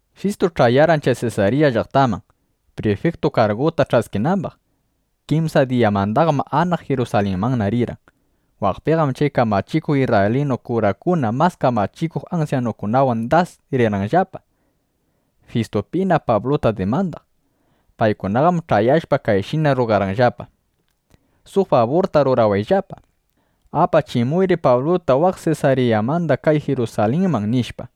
Fistu ch'ayarqan chay Sesarya llaqtaman, prifiktu karguta ch'askinambaq. Kimsa diyamandaqam anaq Jirusalinmanna rirqan. Waqpiqam chay kamachikuq isrraylinu kurakuna mas kamachikuq ansyanukunawan das rirqanllapa, Fistupina Pabluta dimandaq. Paykunaqam ch'ayashpa kayshina rrugarqanllapa: —Suq faburta rurawayllapa. Apachimuyri Pabluta waq Sesaryamanda kay Jirusalinman, nishpa.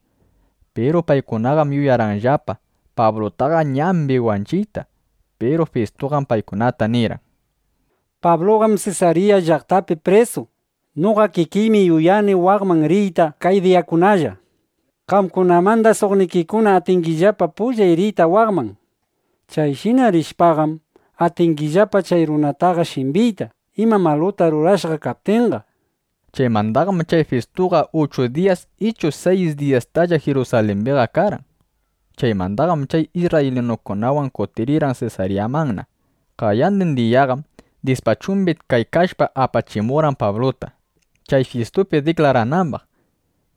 Piru paykunaqam yuyarqanllapa Pablutaqa ñambi wanchiyta. Piru Fistuqam paykunata nirqan: —Pabluqam Sesarya llaqtapi prisu. Noqa kikiymi yuyani waqman riyta kay diyakunalla. Qamkunamandam suqnikikuna atingillapa pullay riyta waqman. Chayshina rishpaqam, atingillapa chay runataqa shimbiyta, ima maluta rurashqa kaptinqa, nishpa. Chaymandaqam chay Fistuqa uchu diyas ichu dyis diyastalla Jirusalimbiqa karqan. Chaymandaqam chay isrraylinukunawan kutirqan Sesaryamanna. Qayandin diyaqam dispachumbina kaykashpa, apachimurqan Pabluta, chay Fistupi diklaranambaq.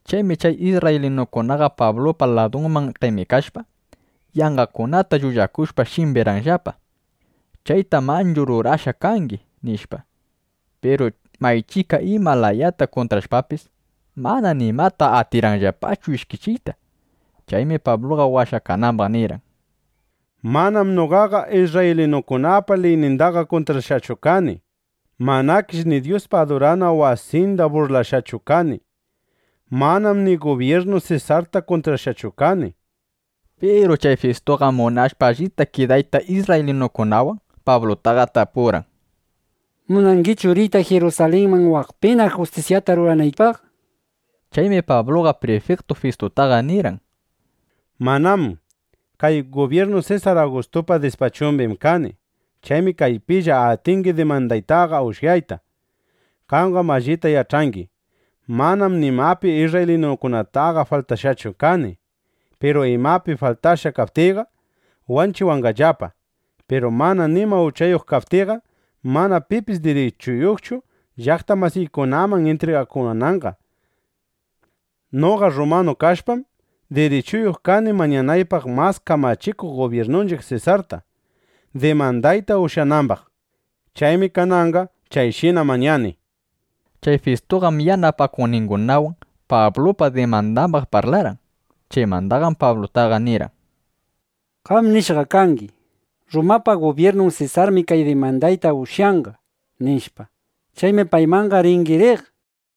Chaymi chay isrraylinukunaqa Pablupa ladunman qemikashpa, yanqakunata llullakushpa, shimbirqanllapa: —Chayta manchu rurashqa kangi, nishpa. Piru maychika ima layata kuntrashpapis, mana nimapi atirqanllapachu ishkichiyta. Chaymi Pabluqa washakanambaq nirqan: —Manam noqaqa isrraylinukunapa liynindaqa kuntrashqachu kani. Manakish ni Dyuspa adurana wasinda burlashqachu kani. Manam ni gubyirnu Sesarta kuntrashqachu kani, nishpa. Piru chay Fistuqam munashpa allita kidayta isrraylinukunawan, Pablutaqa tapurqan: —¿Munangichu riyta Jirusalinman, waqpina kay justisyata ruranaypaq? nishpa. Chaymi Pabluqa prifiktu Fistutaqa nirqan: —Manám. Kay dispachum gubyirnu Sesar Agustupa. Chaymi kaypilla atingi dimandaytaqa ushyayta. Qamqam allita yach'angi: Manam nimapi isrraylinukunataqa faltashqachu kani. Piru imapi faltashqa kaptiyqa, wanchiwanqallapa. Piru mana nima uchayuq kaptiyqam, mana pipis dirichuyuqchu, llaqta masiykunaman intrigakuwananqa. Noqa rrumanu kashpam, dirichuyuq kani mañanaypaq mas kamachikuq gubyirnunchiq Sesarta, dimandayta ushyanambaq. Chaymi kananqa chayshina mañani, nishpa. Chay Fistuqam yanapakuqningunawan Pablupa dimandambaq parlarqan. Chaymandaqam Pablutaqa nirqan: —Qam nishqa kangi: Rrumapa gubyirnun Sesarmi kay dimandayta ushyanqa, nishpa. Chaymi paymanna ringi riq, nishpa.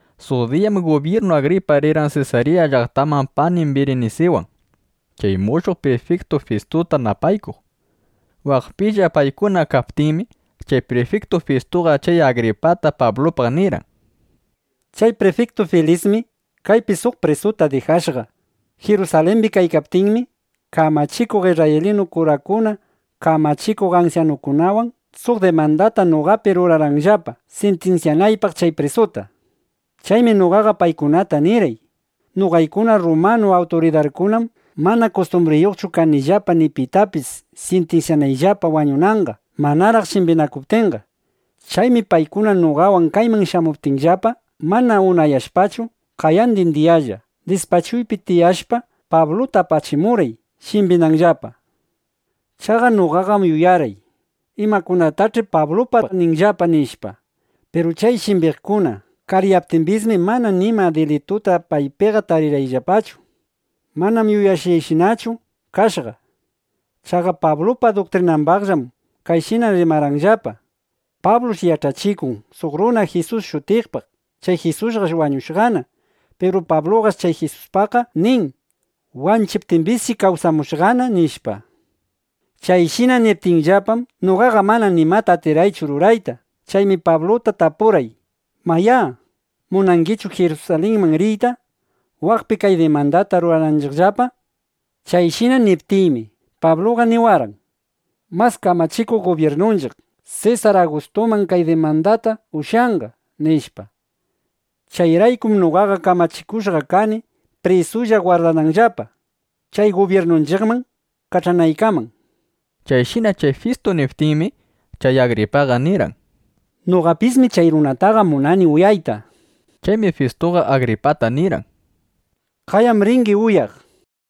Suq diyam gubyirnu Agripa rirqan Sesarya llaqtaman panin Birinisiwan, chay mushuq prifiktu Fistuta napaykuq. Waqpilla paykuna kaptinmi, chay prifiktu Fistuqa chay Agripata Pablupaq nirqan: —Chay prifiktu Filismi kaypi suq prisuta dijashqa. Jirusalimbi kaykaptiymi, kamachikuq isrraylinu kurakuna kamachikuq ansyanukunawan suq dimandata noqapi rurarqanllapa, sintinsyanaypaq chay prisuta. Chaymi noqaqa paykunataqa nirqay: “Noqaykuna rrumanu awturidarkunam mana kustumbriyuqchu kanillapa ni pitapis sintinsyanayllapa wañunanqa, manaraq shimbinakuptinqa”, nishpa. Chaymi paykuna noqawan kayman shamuptiyllapa, mana unayashpachu, qayandin diyalla, dispachuypi tiyashpa, Pabluta apachimurqay, shimbinanllapa. Chaqa noqaqam yuyarqay: Imakunatach'i Pablupaq ninqallapa, nishpa. Piru chay shimbiqkuna kariyaptimbismi, mana nima dilituta paypiqa tarirqaychu. Manam yuyashqayshinachu kashqa. Chaqa Pablupa duktrinambaqllam kayshina rimarqanllapa: Pablush yach'achikun suq runa Jisus shutiqpaq. Chay Jisusqash wañushqana. Piru Pabluqash chay Jisuspaqqa nin: “Wanchiptimbisshi kawsamushqana”, nishpa. Chayshina niptinllapam, noqaqa mana imata atirqaychu rurayta. Chaymi Pabluta tapurqay, “Mayá, ¿munangichu Jirusalinman riyta, waqpi kay dimandata rurananchiqllapa?” Chayshina niptiymi, Pabluqa niwarqan: “Mas kamachikuq gubyirnunchiq Sesar Agustunam kay dimandayta ushyanqa”, nishpa. Chayraykum noqaqa kamachikushqa kani prisulla gwardananllapa, chay gubyirnunchiqman kach'anaykaman, nishpa. Chayshina chay Fistu niptinmi, chay Agripaqa nirqan: —Noqapismi chay runataqa munani uyayta, nishpa. Chaymi Fistuqa Agripata nirqan: —Qayam ringi uyaq, nishpa.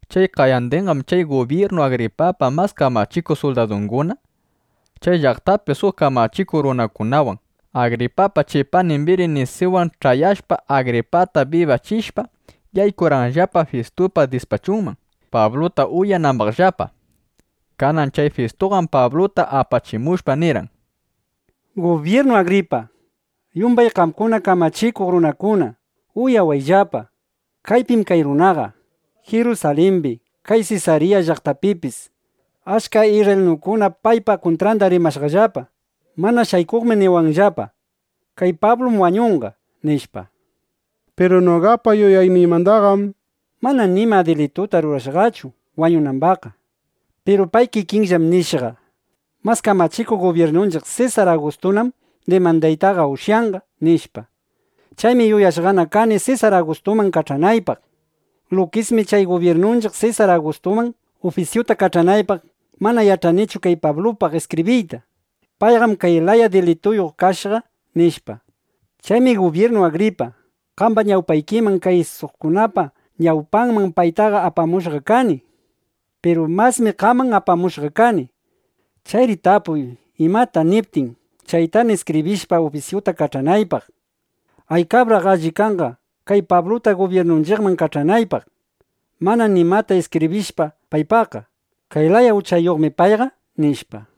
Chay qayandinqam chay gubyirnu Agripapa mas kamachikuq suldadunguna, chay llaqtapi suq kamachikuq runakunawan, Agripapa chay panin Birinisiwan ch'ayashpa, Agripata bibachishpa, yaykurqanllapa Fistupa dispachunman, Pabluta uyanambaqllapa. Kanan chay Fistuqam Pabluta apachimushpa, nirqan: —Gubyirnu Agripa, yumbay qamkuna kamachikuq runakuna, uyawayllapa. Kaypim kay runaqa. Jirusalimbi, kay Sesarya llaqtapipis achka isrraylinukuna paypa kuntranda rimashqallapa. Mana shaykuqmi niwanllapa: “Kay Pablu wañunqa”, nishpa. Piru noqapa yuyayniymandaqam mana nima dilituta rurashqachu wañunambaqqa. Piru pay kikinllam nishqa: “Mas kamachikuq gubyirnunchiq Sesar Agustunam dimandaytaqa ushyanqa”, nishpa. Chaymi yuyashqana kani Sesar Agustuman kach'anaypaq. Lukismi chay gubyirnunchiq Sesar Agustuman ufisyuta kach'anaypaq, mana yach'anichu kay Pablupaq iskibriyta: “Payqam kay laya dilituyuq kashqa” nishpa. Chaymi gubyirnu Agripa, qamba ñawpaykiman, kay suqkunapa ñawpanman paytaqa apamushqa kani. Piru masmi qaman apamushqa kani. Chayri tapuy, imata niptin, chaytana iskibrishpa, ufisyuta kach'anaypaq. Aykabraq alli kanqa kay Pabluta gubyirnunchiqman kach'anaypaq, mana nimata iskibrishpa paypaqqa: “Kay laya uchayuqmi payqa”, nishpa.